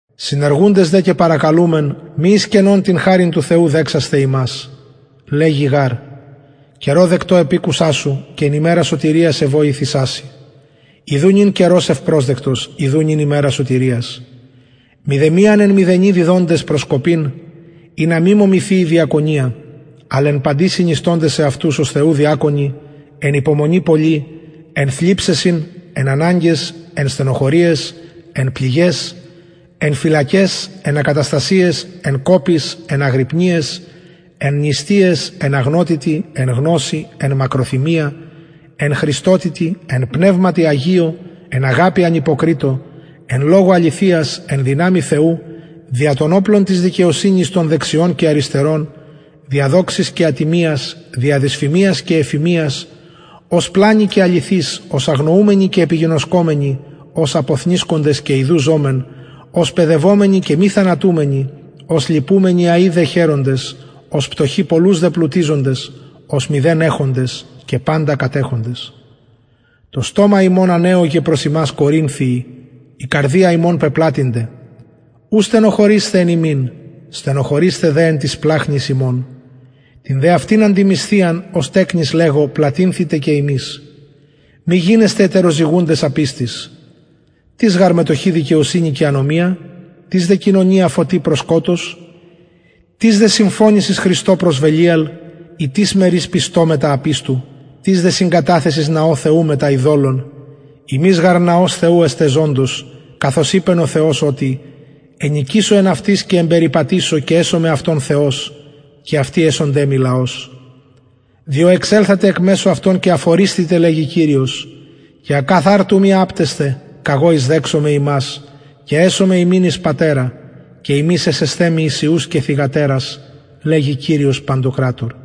συνεργουντες δε και παρακαλουμεν μη εις κενον την χαριν του θεου δεξασθαι υμας λεγει γαρ καιρω δεκτω επηκουσα σου και εν ημερα σωτηριας εβοηθησα σοι ιδου νυν καιρος ευπροσδεκτος ιδου νυν ημερα σωτηριας μηδεμιαν εν μηδενι διδοντες προσκοπην ινα μη μωμηθη η διακονια αλλ εν παντι συνιστωντες εαυτους ως θεου διακονοι εν υπομονη πολλη εν θλιψεσιν εν αναγκαις εν στενοχωριαις εν πληγαις εν φυλακαις εν ακαταστασιαις εν κοποις εν αγρυπνιαις εν νηστειαις εν αγνοτητι εν γνωσει εν μακροθυμια εν χρηστοτητι εν πνευματι αγιω εν αγαπη ανυποκριτω εν λογω αληθειας εν δυναμει θεου δια των οπλων της δικαιοσυνης των δεξιων και αριστερων δια δοξης και ατιμιας δια δυσφημιας και ευφημιας ως πλανοι και αληθεις ως αγνοουμενοι και επιγινωσκομενοι ως αποθνησκοντες και ιδου ζωμεν ως παιδευομενοι και μη θανατουμενοι ως λυπουμενοι αει δε χαιροντες ως πτωχοι πολλους δε πλουτιζοντες ως μηδεν εχοντες και παντα κατεχοντες το στομα ημων ανεωγεν προς υμας κορινθιοι η καρδια ημων πεπλατυνται ου στενοχωρεισθε εν ημιν στενοχωρεισθε δε εν τοις σπλαγχνοις υμων την δε αυτην αντιμισθιαν ως τεκνοις λεγω πλατυνθητε και υμεις μη γινεσθε ετεροζυγουντες απιστοις τις γαρ μετοχη δικαιοσυνη και ανομια τις δε κοινωνια φωτι προς σκοτος τις δε συμφωνησις χριστω προς βελιαρ η τις μερις πιστω μετα απιστου τις δε συγκαταθεσις ναω θεου μετα ειδωλων υμεις γαρ ναος θεου εστε ζωντος καθως ειπεν ο θεος οτι ενοικησω εν αυτοις και εμπεριπατησω και εσομαι αυτων θεος και αυτοι εσονται μοι λαος διο εξελθετε εκ μεσου αυτων και αφορισθητε λεγει κυριος και ακαθαρτου μη απτεσθε καγω εισδεξομαι υμας και εσομαι υμιν εις πατερα και υμεις εσεσθε μοι εις υιους και θυγατερας λεγει κυριος παντοκρατωρ